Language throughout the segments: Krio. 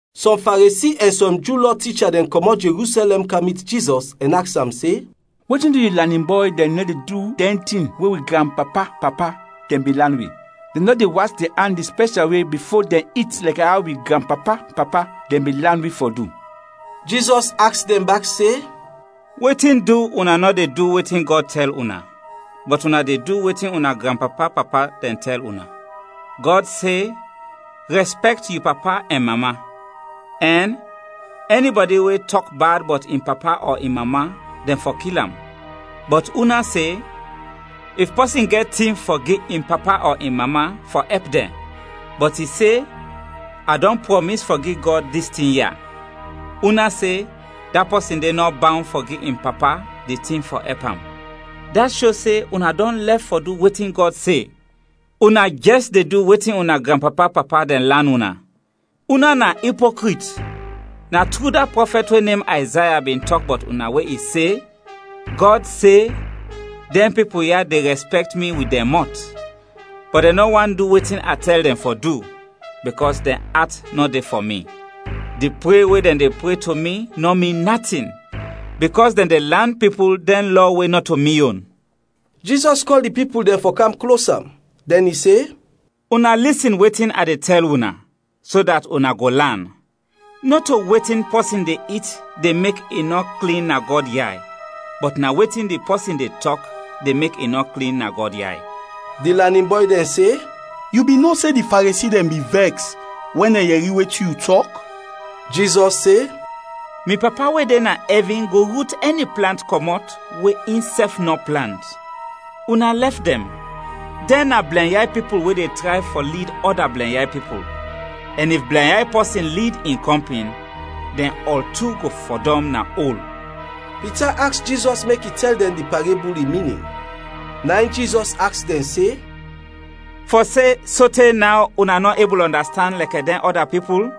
Sɔm Faresi ɛn sɔm Ju Lɔ ticha dɛn kɔmɔt Jerusɛlɛm kam mit Jizɔs ɛn aks am se, “Wetin du yu lanin bɔy dɛn nɔ de du dɛn tin we wi granpapa-papa dɛn bin lan wi? Dɛn nɔ de was dɛn an di spɛshal we bifo dɛn it lɛkɛ aw wi granpapa-papa dɛn bin lan wi fɔ du.” Jizɔs aks dɛn bak se, “Wetin du una nɔ de du wetin Gɔd tɛl una, bɔt una de du wetin una granpapa-papa dɛn tɛl una? Gɔd se, ‘Rɛspɛkt yu papa ɛn mama,’ ɛn ‘Ɛnibɔdi we tɔk bad bɔt in papa ɔ in mama, dɛn fɔ kil am.’ Bɔt una se, if pɔsin gɛt tin fɔ gi in papa ɔ in mama fɔ ɛp dɛn, bɔt i se, ‘A dɔn prɔmis fɔ gi Gɔd dis tin ya,’ una se da pɔsin de nɔ bawn fɔ gi in papa di tin fɔ ɛp am. Dat sho se una dɔn lɛf fɔ du wetin Gɔd se, una jɛs de du wetin una granpapa-papa dɛn lan una. Una na ipokrit! Na tru da prɔfɛt we nem Ayzaya bin tɔk bɔt una we i se, ‘Gɔd se, dɛn pipul ya de rɛspɛkt mi wit dɛn mɔt, bɔt dɛn nɔ want du wetin a tɛl dɛn fɔ du, bikɔs dɛn at nɔ de fɔ mi. Di pre we dɛn de pre to mi nɔ min natin, bikɔs dɛn de lan pipul dɛn lɔ we nɔto mi yon.’” Jizɔs kɔl di pipul dɛn fɔ kam klos am, dɛn i se, “Una lisin wetin a de tɛl una, so dat una go lan! Nɔto wetin pɔsin de it de mek i nɔ klin na Gɔd yay, bɔt na wetin di pɔsin de tɔk de mek i nɔ klin na Gɔd yay.” Di lanin bɔy dɛn se, “Yu bin no se, di Faresi dɛn bin vɛks wɛn dɛn yɛri wetin yu tɔk?” Jizɔs se, “Mi Papa we de na ɛvin go rut ɛni plant kɔmɔt we insɛf nɔ plant. Una lɛf dɛn; dɛn na blɛnyay pipul we de tray fɔ lid ɔda blɛnyay pipul, ɛn if blɛnyay pɔsin lid in kɔmpin, dɛn ɔl tu go fɔdɔm na ol.” Pita aks Jizɔs mek i tɛl dɛn di parebul in minin. Na in Jizɔs aks dɛn se, “Fɔ se, sote naw, una nɔ ebul ɔndastand lɛkɛ dɛn ɔda pipul?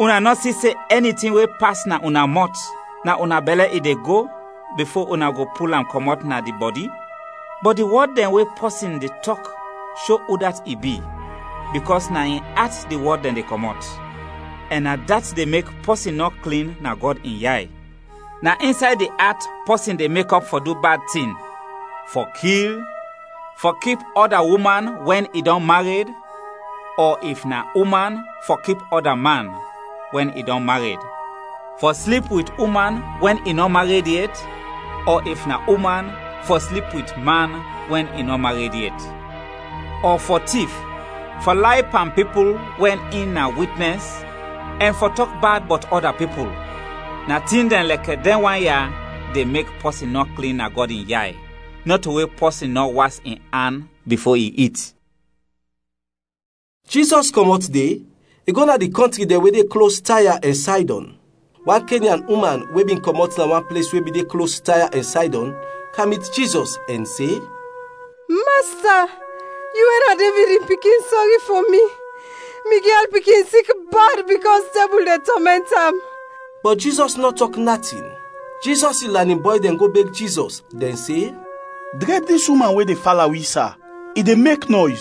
Una nɔ si se ɛni tin we pas na una mɔt, na una bɛlɛ i de go, bifo una go pul am kɔmɔt na di bɔdi? Bɔt di wɔd dɛn we pɔsin de tɔk sho udat i bi, bikɔs na in at di wɔd dɛn de kɔmɔt, ɛn na dat de mek pɔsin nɔ klin na Gɔd in yay. Na insay di at pɔsin de mekɔp fɔ du bad tin, fɔ kil; fɔ kip ɔda uman wɛn i dɔn mared, ɔ, if na uman, fɔ kip ɔda man, wɛn i dɔn mared; fɔ slip wit uman wɛn i nɔ mared yet, ɔ if na uman, fɔ slip wit man wɛn i nɔ mared yet; ɔ fɔ tif; fɔ lay pan pipul wɛn in na witnɛs, ɛn fɔ tɔk bad bɔt ɔda pipul. Na tin dɛn lɛkɛ dɛn wan ya de mek pɔsin nɔ klin na Gɔd in yay, nɔto we pɔsin nɔ was in an bifo i it.” Jizɔs kɔmɔt de, i go na di kɔntri dɛn we de klos Taya ɛn Saydɔn. Wan Kenyan uman, we bin kɔmɔt na wan ples we bin de klos Taya ɛn Saydɔn, kam mit Jizɔs ɛn se, “Masta, yu we na Devid in pikin, sɔri fɔ mi! Mi gyal pikin sik bad bikɔs dɛbul de tɔmɛnt am.” Bɔt Jizɔs nɔ tɔk natin. Jizɔs in lanin bɔy dɛn go beg Jizɔs, dɛn se, “Drɛb dis uman we de fala wi, sa, i de mek nɔys!”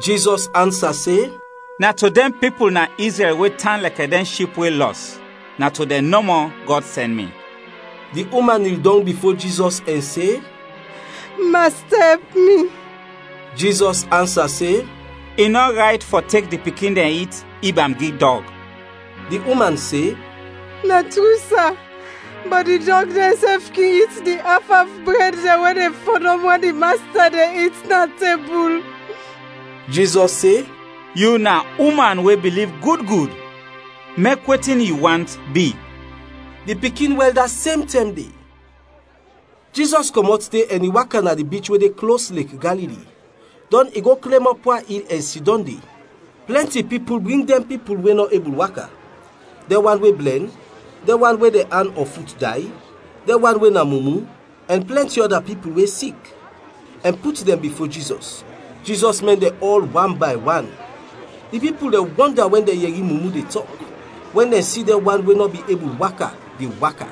Jizɔs ansa se, “Na to dɛn pipul na Izrɛl we tan lɛkɛ dɛn ship we lɔs, na to dɛn nɔmɔ Gɔd sɛn mi.” Di uman nil dɔng bifo Jizɔs ɛn se, “Masta, ɛp mi.” Jizɔs ansa se, “I nɔ rayt fɔ tek di pikin dɛn it ib am gi dɔg.” Di uman se, “Na tru, sa, bɔt di dɔg dɛnsɛf kin it di af af bred dɛn we de fɔdɔm wɛn di masta de it na tebul.” Jizɔs se, “Yu na uman we biliv gud gud! Mek wetin yu want bi.” Di pikin wɛl da sem tɛm de. Jizɔs kɔmɔt de ɛn i waka na di bich we de klos Lek Galili, dɔn i go klem ɔp wan il ɛn sidɔm de. Plɛnti pipul bring dɛn pipul we nɔ ebul waka, dɛn wan we blɛn, dɛn wan we dɛn an ɔ fut day, dɛn wan we na mumu, ɛn plɛnti ɔda pipul we sik, ɛn put dɛn bifo Jizɔs. Jizɔs mɛn dɛn ɔl wan bay wan. Di pipul dɛn wɔnda wɛn dɛn yɛri mumu de tɔk; wɛn dɛn si dɛn wan we nɔ bin ebul waka, de waka;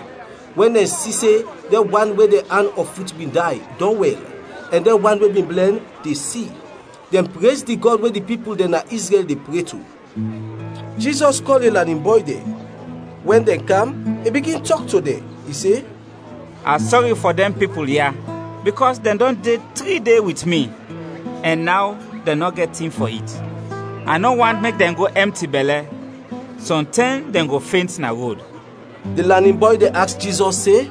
wɛn dɛn si se dɛn wan we dɛn an ɔ fut bin day, dɔn wɛl; ɛn dɛn wan we bin blɛn, de si. Dɛn prez di Gɔd we di pipul dɛn na Izrɛl de pre to. Jizɔs kɔl in lanin bɔy dɛn. Wɛn dɛn kam, i bigin tɔk to dɛn, i se, “A sɔri fɔ dɛn pipul ya, bikɔs dɛn dɔn de tri de wit mi, ɛn naw dɛn nɔ gɛt tin fɔ it. A nɔ want mek dɛn go ɛmti bɛlɛ, sɔntɛm dɛn go fent na rod.” Di lanin bɔy dɛn aks Jizɔs se,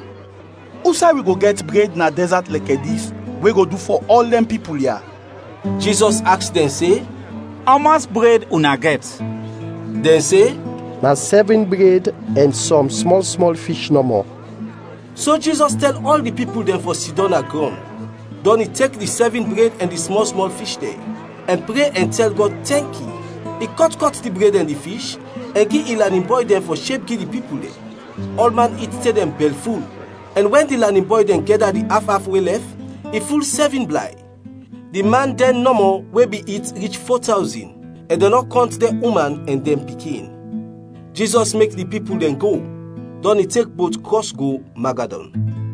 “Usay wi go gɛt bred na dɛzat lɛkɛ dis, we go du fɔ ɔl dɛn pipul ya?” Jizɔs aks dɛn se, “Ɔmɔs bred una gɛt?” Dɛn se, “Na sɛvin bred ɛn sɔm smɔl-smɔl fish nɔmɔ.” So Jizɔs tɛl ɔl di pipul dɛn fɔ sidɔm na grɔn. Dɔn i tek di sɛvin bred ɛn di smɔl-smɔl fish dɛn, ɛn pre ɛn tɛl Gɔd tɛnki; i kɔt kɔt di bred ɛn di fish, ɛn gi in lanin bɔy dɛn fɔ sheb gi di pipul dɛn. Ɔlman it te dɛn bɛlful. Ɛn wɛn di lanin bɔy dɛn gɛda di af af we lɛf, i ful sɛvin blay. Di man dɛn nɔmɔ we bin it rich fo tawzin, ɛn dɛn nɔ kɔnt dɛn uman ɛn dɛn pikin. Jizɔs mek di pipul dɛn go, dɔn i tek bot krɔs go Magadɔn.